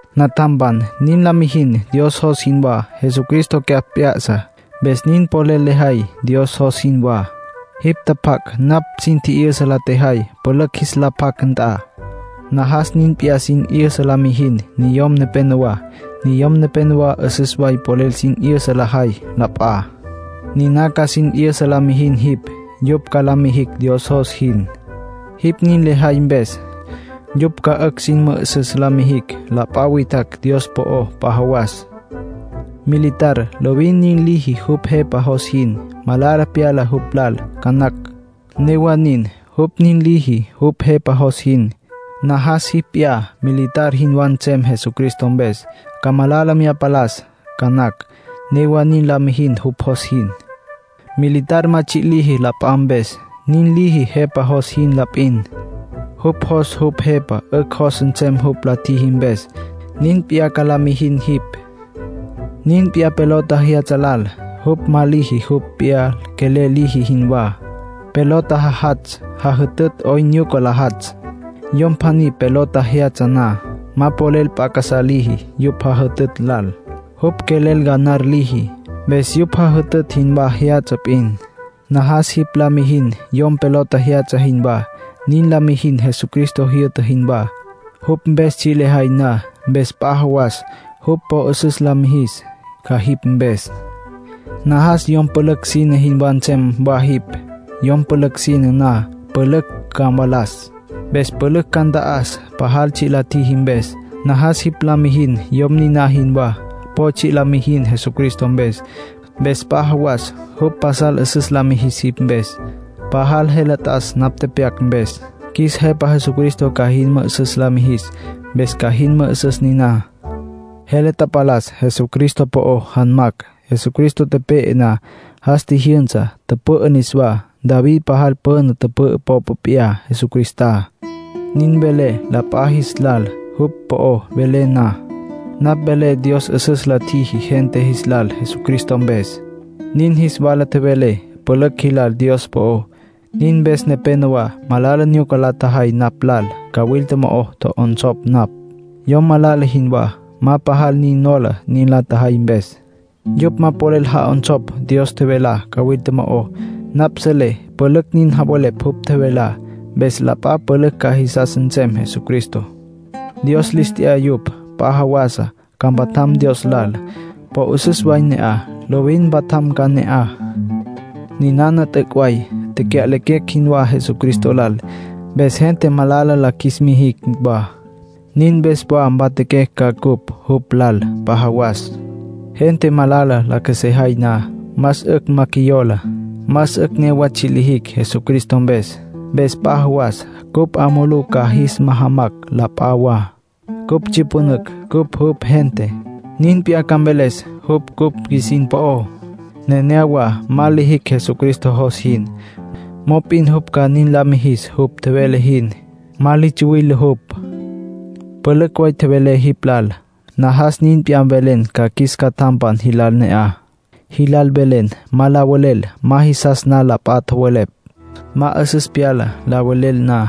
Natjam, nin la mijin Dios jos jinwá. Jesucristo cyapj p'ya'sa, mpes nin polel lejay Dios jos jinwá. Jipj tjapjac' napj sin tji'yüsa la tjejay pülücj jis la pjac nt'a. Najas nin p'iyá sin 'yüsa la mijin niyom nepenowá. Niyom nepénowa 'üsüs way polel sin 'yüsa lajay la p'a. Niná ca sin 'yüsa la mijin jipj. Yupj ca la mijicj Dios jos jin. Jipj nin lejay mpes, yupj ca 'ücj sin mü'üsüs lis mijicj la p'a witjacj Dios po'ó p'a jawas. Militar lovin nin liji jupj jepa jos jin. Malala pyala jupj lal ca nacj; newa nin, jupj nin liji jupj jepa jos jin. Najas jipj p'iyá militar jinwá nsem Jesucristo mpes. Ca malala mya palas ca nacj; newa nin la mijin jupj jos jin. Militar ma tsji' liji la p'a mpes. Nin liji jepa jos jin la p'in. Jupj jos jupj jepa 'ücj jos nsem jupj la tjiji mpes. Nin p'iyá ca la mijin jipj. Nin p'iyá pelota jyatsja lal. Jupj ma liji jupj p'iyá quelel liji jinwá. Pelota jajatsj jajütütj 'oyn nyuca la jatsj. Yom pjaní pelota jyatsja na, ma polel p'a casá liji yupj jajütütj lal. Jupj quelel ganar liji, mpes yupj jajütütj jinwá jyatsja p'in. Najas jipj la mijin yom pelota jyatsja jinwá. Nin la mijin Jesucristo jyü'ta jinwá, jupj mpes tsji' lejay na. Mpes p'a jawas jupj po 'üsüs la mijis ca jipj mpes. Najas yom pülücj sine jinwá nsem wa jipj. Yom pülücj sine na, pülücj ca mvalas. Mpes pülücj ca nta'as pajal tsji' la tjiji mpes. Najas jipj la mijin yom niná jinwá. Po tsji' la mijin Jesucristo mpes. Mpes p'a jawas jupj pasal 'üsüs la mijis jipj mpes. Pajal jele t'as napj tepyac mpes. Qjuis Jepa Jesucristo ca jin mü'üsüs la mijis, mpes ca jin mü'üsüs niná. Jele tapalas Jesucristo po'ó janmacj. Jesucristo tepe'e na, jas tjijyünsa, tüpü'ü niswá. David pajal püna tüpü'ü popa p'iyá Jesucristá. Nin velé la p'a jis lal jupj po'ó velé na. Napj velé Dios 'üsüs la tjiji gente jis lal Jesucristo mpes. Nin jis wala tjevelé pülücj jilal Dios po'ó. Nin mpes nepénowa malala nyuca la tjajay napj lal. Cawilta mo'o tjo'onsopj napj, yom malala jinwá. Ma pajal nin nola nin la tjajay mpes. Yupj ma polel ja'onsopj Dios tjevelá cawilta mo'ó. Napj selé pülücj nin javelepj jupj tjevelá, mpes la p'a pülücj ca jisas nsem Jesucristo. Dios lis t'ya yupj. P'a jawasa ca mpatjam Dios lal. Po 'üsüs way ne'aj; lovin mpatjam ca ne'aj. Ninana t'üc' way: “Tecya'lequecj jinwá Jesucristo lal, mpes gente malala la qjuis mijicj wa. Nin mpes wa mpatjaquecj ca cupj jupj lal p'a jawas. Gente malala la qjuesejay na, más 'ücj ma qjuiyola. Más 'ücj newa tsji' lijicj Jesucristo mpes. Mpes p'a jawas cupj 'a mulú ca jis majamacj la p'a wa. Cupj tsyüpünücj cupj jupj gente, nin p'iyá ca mveles jupj cupj qjuisin po'ó. Nenéyawa ma lijicj Jesucristo jos jin, mop'in jupj ca nin la mijis jupj tjevele jin. Ma li tsuwile jupj.” Pülücj way tjevelé jipj lal. Najas nin p'iyá mvelen ca qjuis catjampan jilal ne'aj. Jilal mvelen ma la velel ma jisas na la p'a tjowelepj. Ma 'üsüs pyala la velel na.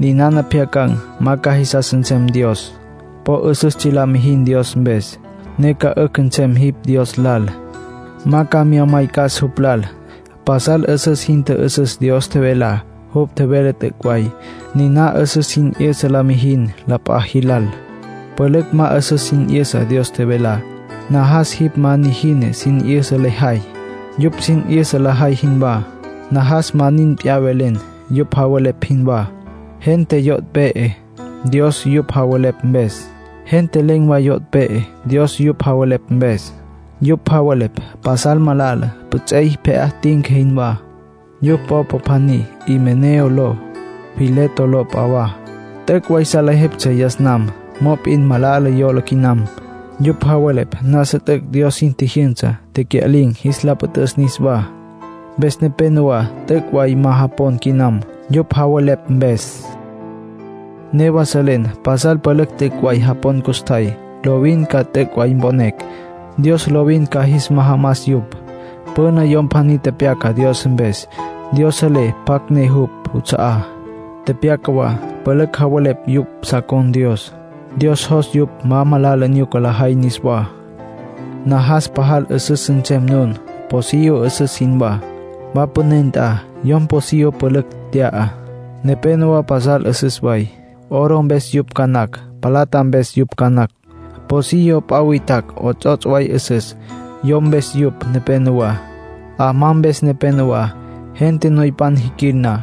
Ninana pjyacan̈ ma ca jisas nsem Dios. Po 'üsüs tsji' la mijin Dios mpes, ne ca 'ücj nsem jipj Dios lal. Ma ca mya maycas jupj lal. Pasal 'üsüs jin tjü'üsüs Dios tjevelá. Jupj tjevelá t'üc' way. Niná 'üsüs sin 'yüsa la mijin la p'a jilal. Pülücj ma 'üsüs sin 'yüsa Dios tjevelá. Najas jipj ma nijina sin 'yüsa lejay, yupj sin 'yüsa lajay jinwá. Najas ma nin p'iyá velen, yupj javelepj jinwá. Gente yo' pe'e Dios yupj javelepj mpes. Gente len̈ way yo' pe'e Dios yupj javelepj mpes. Yupj javelepj pasal malala, püts'ey pje'á tinca jinwá. Yupj popa pjaní Himeneo ló. Fileto ló p'a wa. T'üc' way salejeptsja yas nam. Mop'in malala yola quinam. Yupj javelepj nasa t'üc' Dios sin tjijyünsa tecya'lin̈, jis la püt'üs niswá. Mpes nepénowa t'üc' way ma japon quinam, yupj javelepj mpes. Newa selecj pasal pülücj t'üc' way japon custjay. Lovin ca t'üc' way mponecj. Dios lovin ca jis majamas yupj. Püna yom pjaní tepyaca Dios mpes: “Dios selé pjacj ne jupj juts'a'á”. Tepyaca wa: “Pülücj javelepj yupj sa con̈ Dios. Dios jos yupj ma malala nyuca lajay niswá.” Najas pajal 'üsüs nsem nun, pocillo 'üsüs jinwá. Wa püné nt'a, yom pocillo pülücj tya'a. Nepénowa pasal 'üsüs way, oro mpes yupj ca nacj, plata mpes yupj ca nacj. Pocillo p'a witjacj 'ots'ots' way 'üsüs; yo mpes yupj nepenowá, 'amá mpes nepenowá. Gente noypan jiquil na,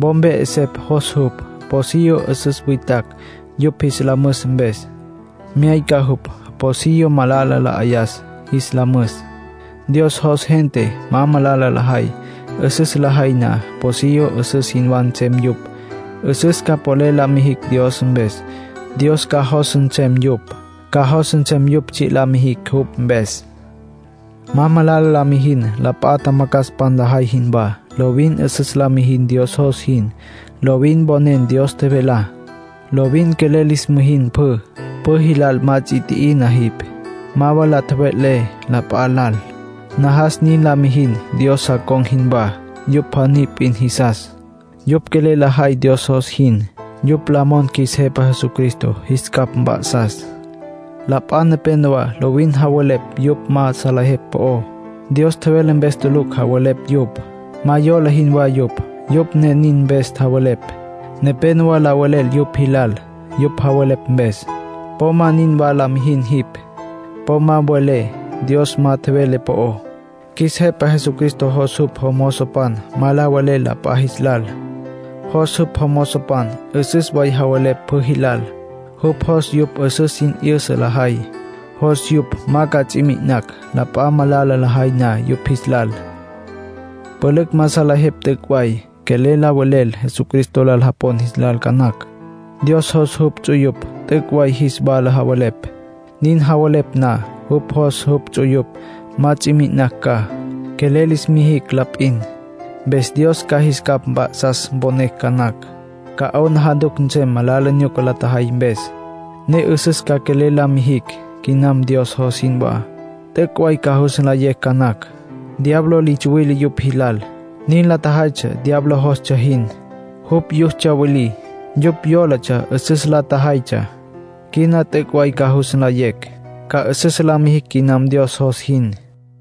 wo mpe 'esepj jos jupj pocillo 'üsüs witjacj yupj jis la müs mpes. Myayca jupj pocillo malala la 'ayas jis la müs. Dios jos gente ma malala lajay. 'Üsüs lajay na, pocillo 'üsüs jinwá nsem yupj, 'üsüs ca polel la mijicj Dios mpes. Dios ca jos nsem yupj. Ca jos nsem yupj tsji' la mijicj jupj mpes. Ma malala la mijin, p'a tjamacjaspan lajay jinwá. Lovin 'üsüs la mijin Dios jos jin. Lovin mponen Dios tjevelá. Lovin quelel lis mijin pjü. Pjü jilal ma ts'i tji'ina jipj. Ma wa la tjeve'le p'a lal. Najas nin la mijin Dios sa con̈ jinwá. Yupj pjaní p'in jisas; yupj quelel lajay Dios jos jin. Yupj la mon qjuis Jepa Jesucristo jis capj mp'a'sas. La p'a nepenowá lovin javelepj yupj ma salejepj po'ó. Dios tjevele mpes tulucj javelepj yupj. Ma yola jinwá yupj, yupj ne nin mpes javelepj. Nepénowa la velel yupj jilal, yupj javelepj mpes. Po ma ninwa la mijin jipj. Po ma mve'lé Dios ma tjevele po'ó. Qjuis Jepa Jesucristo jos jupj jomozopan ma la velel la p'a jis lal. Jos jupj jomozopan 'üsüs way javelepj pjü jilal. Jupj jos yupj 'üsüs sin 'yüsa lajay. Jos yupj ma ca ts'i mi'inacj la p'a malala lajay na yupj jis lal. Pülücj ma salejepj t'üc' way. Quelel la velel Jesucristo lal japon jilal ca nacj. Dios jos jupj ts'uyupj t'üc' way jis wala javelepj. Nin javelepj na, jupj jos jupj ts'uyupj ma ts'i mi'inacj ca. Quelel lis mijicj la p'in, mpes Dios ca jis capj mp'a'sas mponecj ca nacj. Ca 'aplijila nsem malala nyuca la tjajay mpes, ne 'üsüs ca quelel la mijicj quinam Dios jos jinwá. T'üc' way ca jus nlayecj ca nacj. Diablo li tsuwile yupj jilal. Nin la tjajaytsja diablo jostsja jin, jupj yus tsyawilí. Yupj yólatsja 'üsüs la tjajaytsja. Quina t'üc' way ca jus nlayecj. Ca 'üsüs la mijicj quinam Dios jos jin.